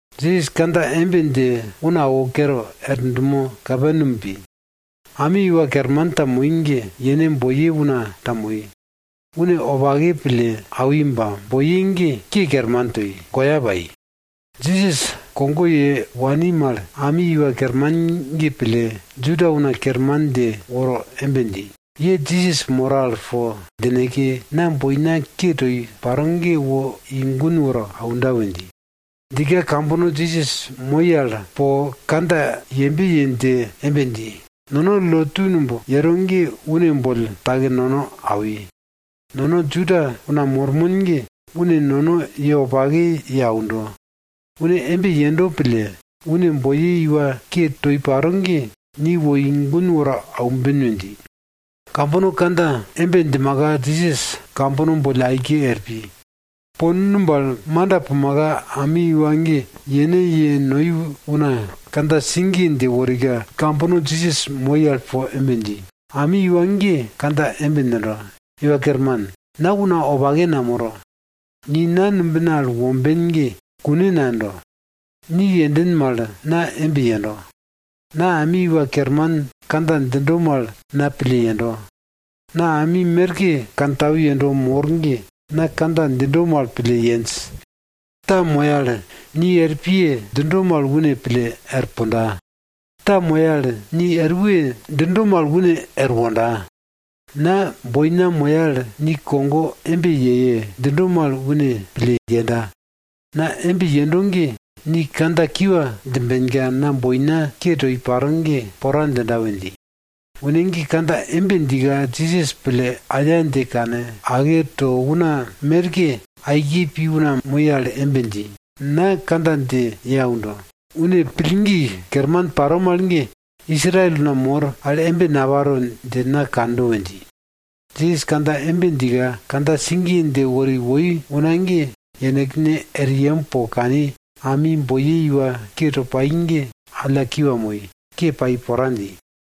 Jisas kandja embe dje una awo kere, er dumo Kaperneam pi. Ami iwa kerman ta moi ge, yene boiye una ta moi. Une wopake pille awi ba, boiye ge ke kerman toi, goya pai. Jisas kogo ye wani mal ami iwa kerman ge pille, Juda una kerman dje woro embe dji, ye Jisas moro al po djineke, na boina ke toi paro ge wo i gun woro aunda we dji. Djika kambono Jisas moi al po kandja yembe ye dje embe dji, nono lotu numb yero ge une boll take nono awi. Nono Juda una mormon ge, une nono ye wopake ye aundo. Une embe yendo pille, une boiye iwa ke toi paro ge, ni wo i gun woro aumben we dji. Kambono kandja embe djimaka, Jisas kambono boll aike er pi. Po numb al manda pumaka, ami iwa ge yene ye noi una kandja sigiye dje worika, kambono Jisas moi al po embe dji, ami iwa ge kandja embe djindo, Iwa Kerman, na una wopake namoro, ni na numbina al womben ge kune nayendo. Ni yenden mal, na embe yendo. Na ami iwa kerman kandja djindo mal na pille yendo. Na ami merke kantau yendo mor ge, na kandja djindo mal pille yenj. Ta moya al, ni er piye! djindo mal une pille er punda. Ta moya al, ni er we! djindo mal une er wonda. Na boina moya al, ni kogo embe yeye! djindo mal une pille yenda. Na embe yendo ge, ni kandja kiwa djimbenka, na boina ke toi paro ge pora djinda we dji. Une ge kandja embe djika, Jisas pille aya dje kane ake to una merke aike pi una moi al embe dji, na kandja dje ye aundo, une pillgi kerman paro mal ge, Israel una mor al ge, embe naparo dje na kando we dji. Jisas kandja embe djika, kandja sigiye dje wori woi una ge yenekne er yem po kani, ami boiye iwa ke toi pai ge alla kiwa moi, ke pai pora dji.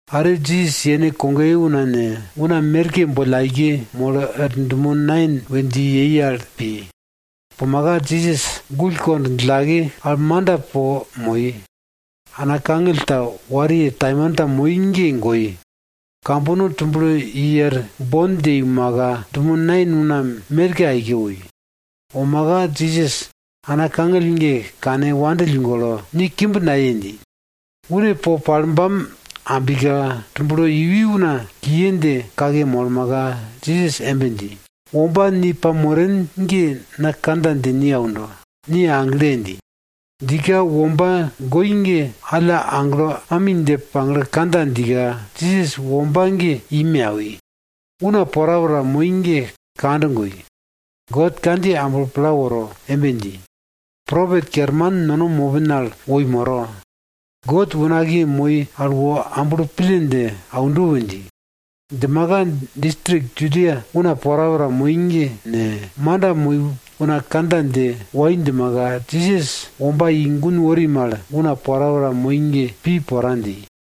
Are Jisas yene kogoye una ne, una merke boll aike molo er dumo Nain pi. Pumaka Jisas gull kond djillake al manda po moi. Ana kangill ta wariye taimanta moi ge goi, kambono tublo i er bon dje iumaka, dumo Nain una merke aike woi. Womaka Jisas ana kangill ge kane wandill golo, ni kimb naye! dji. Une po palbam ambika, tumblo iwi una kiye dje kake molmaka, Jisas embe dji, womba ni pamoren ge na kandja dje ni aundo, ni agle! dji. Djika womba goi ge, alla aglo ami dje pagle kandja djika, Jisas womba ge i me awi. Una porapora moi ge kand goi. God kandjiye amblo pla woro embe dji, propet kerman nono mopin al woi moro, God unakiye moi al wo amblo pille dje aundo we dji. Djimaka distrik Judia una porapora moi ge ne, manda moi una kandja dje wai djimaka, Jisas womba i gun wori mal, una porapora moi ge pi pora dji.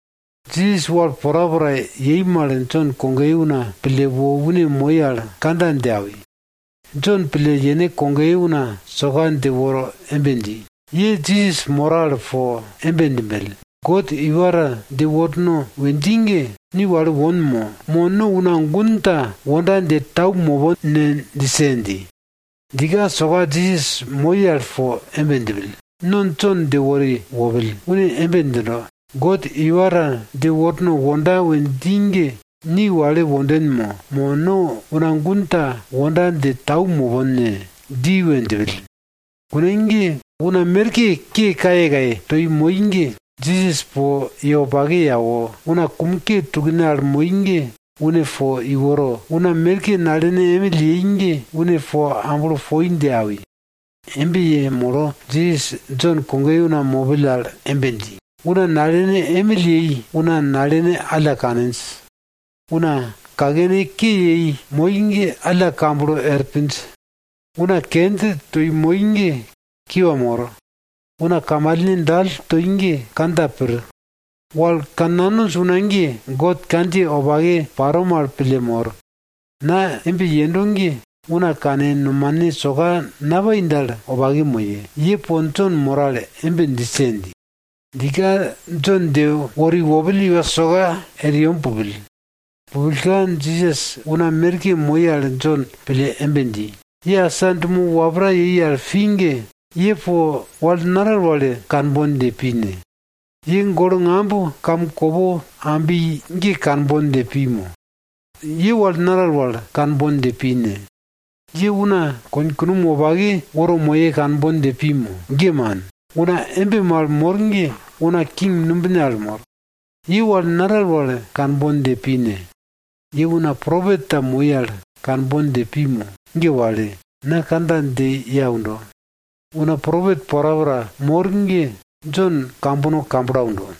Jisas wal porapora yei mal Jon kogoye una pille wo une moi al kandja dje awi. Jon pille yene kogoye una soka dje woro embe dji, ye Jisas moro al po embe djimbell, God iwa ta dje worno we dji ge, ni wale won mo, mo no una gun ta wonda dje tau mopon ne djise! dji. Djika soka Jisas moi al po embe djipill, no Jon dje wori wopill. Une embe djindo, God iwa ta dje worno wonda we dji ge ni wale wonden mo, mo no una gun ta wonda dje tau mopon ne? dji we djipill. Kune ge una merke ke kayekaye toi moi ge, Jisas po ye wopake ye awo, una kum ke tukne al moi ge une po iworo, una merke nalene emill yei ge une po amblo poi dje awi. Embe yemolo, Jisas Jon kogoye una mopill al embe dji, una nalene emill yei una nalene alla kaninj. Una kakene ke yei moi ge alla kamblo er pinj. Una kenj toi moi ge kiwa mor. Una kamalne dall toi ge kandja pir. Wal kannanonj una ge, God kandjiye wopake paro mal pille mor. Na embe yendo ge una kane nomane soka napai dal wopake moye, ye po Jon moro al embe djise! dji. Djika Jon dje wori wopill iwa soka er yem pupill. Pupillka, Jisas una merke moi al Jon pille embe dji, ye asa dumo wapra yei al pi ge, ye po wal naral wal kanbon dje pi ne? Ye golo ngamb kamkopo ambi ge kanbon dje pi mo? Ye wal naral wal kanbon dje pi ne? Ye una konkunom wopake woro moye kanbon dje pi mo? Ge man. Una embe mal mor ge una king numbine al mor. Ye wal naral wal kanbon dje pi ne? Ye una propet ta moi al kanbon dje pi mo? Ge wale. Na kandja dje ye aundo, una propet porapora mor ge Jon kambono kamblo aundo.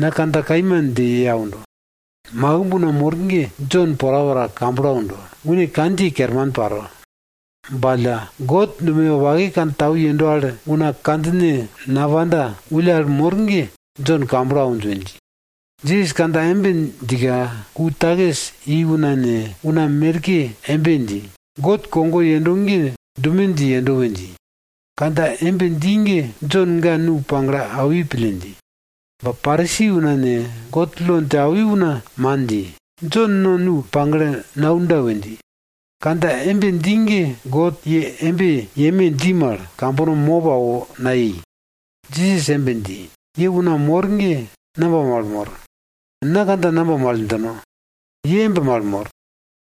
Na kandja kaima dje ye aundo, makimb una mor ge Jon porapora kamblo aundo, une kandjiye kerman paro. Ba alla, God dumoye wopake kantau yendo al una kandjine napanda wulle al mor ge, Jon kamblo awinj we dji. Jisas kandja embe djika, ku takis i una ne, una merke embe dji, God kogo yendo ge dume dje yendo we dji. Kandja embe dji ge Jon ga nu pagle awi pille dji. Ba Parisi una ne, God lo dje awi una man dji, Jon no nu pagle naunda we dji. Kandja embe dji ge God, ye embe yeme dji mal, kambono mop awo nayei. Jisas embe dji, ye una mor ge namba mal mor? Na kandja namba mal djino? Ye embe mal mor.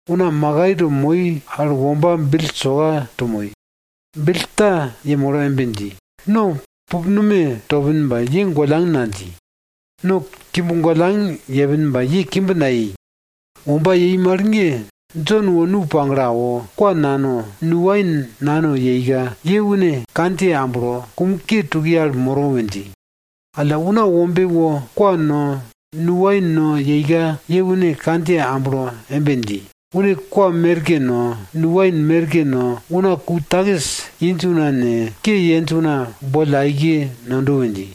Una makai to moi al womba bill soka to moi. Bill ta yemolo embe dji, no pupnume topin ba, ye gollang nadji. No kimb gollang yepin ba, ye kimb nayei. Womba yei mal ge, Jon wo nu pagle awo, kwa nano, nu wain nano yeika, ye une kandjiye amblo, kum ke tukiye al moro we dji. Alla Una Wombe wo kwa no, nu wain no yeika, ye une kandjiye amblo embe dji, une kwa merke no, nu wain merke no, una ku takis inj una ne, ke yenj una boll aike nondo we dji.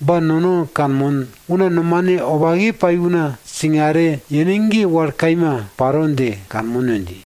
Ba nono kanmon, una nomane wopake pai una singare yene ge wal kaima paro dje kanmon we dji.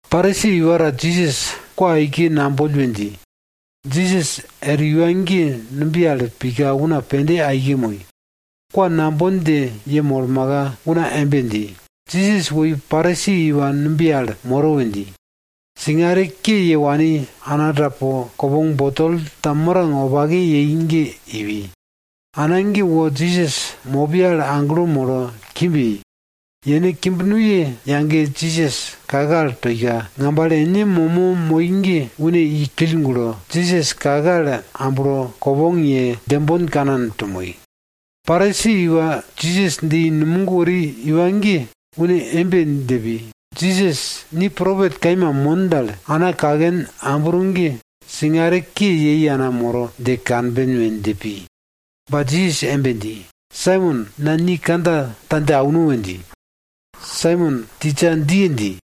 Parisi iwa ta Jisas kwa aike namboll we dji. Jisas er iwa ge numbiye al pika una pende aike moi. Kwa nambon dje yemolmaka, una embe dji, Jisas woi Parisi iwa numbiye al moro we dji. Singare ke ye wani ana ta po kopong nume ta mirang wopake yei ge iwi. Ana ge wo Jisas mopiye al aglo molo kimb yei. Yene kimb nuye yage Jisas kake al toika, ngambale ene momo moi ge une i kill gulo, Jisas kake al amblo, kopong ye, djembon kanan to moi. Parisi iwa Jisas dje i numog wori iwa ge une embe dje pi, Jisas ni propet kaima mon dal, ana kaken ambro ge singare ke yei ana moro dje kanben we dje pi. Ba Jisas embe dji, Saimon na ni kandja ta dje auno we dji. Saimon, tisa, djiye! dji.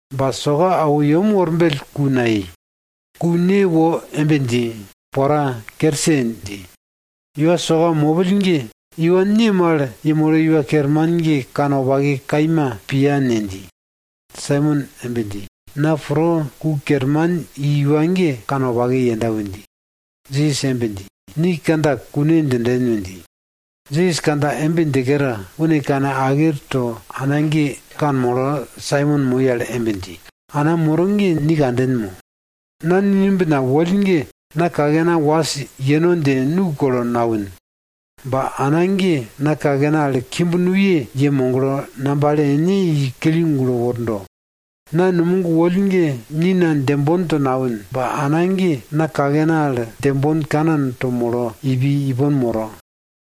Ba soka awo yem worbell ku nayei. Ku ne wo embe dji, pora, kerse! dji. Iwa soka mopill ge, iwa ne mal yemolo iwa kerman ge kanwopake kaima piya ne? dji. Saimon embe dji, na pro ku kerman i iwa ge kanwopake yenda we dji. Jisas embe dji, ni kandja kune djinden we dji. Jisas kandja embe dje kere, une kane ake to ana ge kanmolo Saimon moi al embe dji, ana moro ge ni kanden mo? Na ni numbin al woll ge, na kakena was yeno dje nu kolo nawin. Ba ana ge na kakena al kimb nuye ye moglo, ngambale ene i kill gulo wordo. Na numog woll ge ni na djembon to nawin. Ba ana ge na kakena al djembon kanan to molo ipi ipon moro.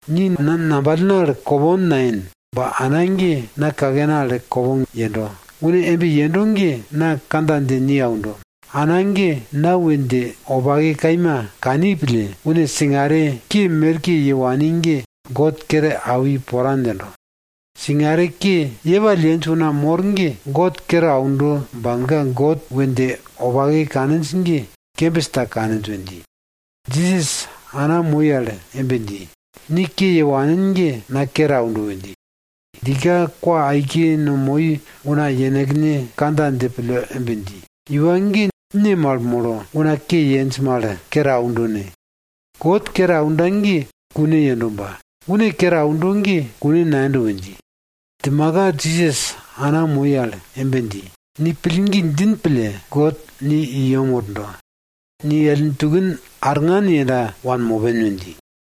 Ni na ngambalna al kopong nayen. Ba ana ge na kakena al kopong yendo. Une embe yendo ge na kandja dje ni aundo, ana ge na we dje wopake kaima kani pille, une singare ke merke ye wani ge God kere awi pora djindo. Singare ke yepall yenj una mor ge, God kere aundo ba, ga God we dje wopake kaninj ge kembis ta kaninj we dji. Jisas ana moi al embe dji, ni ke ye wanin ge na kere aundo we dji. Djika kwa aike no moi una yenekne kandja dje pille embe dji, iwa ge ne mal molo una ke yenj mal kere aundo ne? God kere aunda ge kune yendo ba, une kere aunda ge kune nayendo we dji. Djimaka Jisas ana moi al embe dji, ni pillgi djin pille, God ni i yem wordo. Ni ellin tukin arngan yenda wanmopen we dji.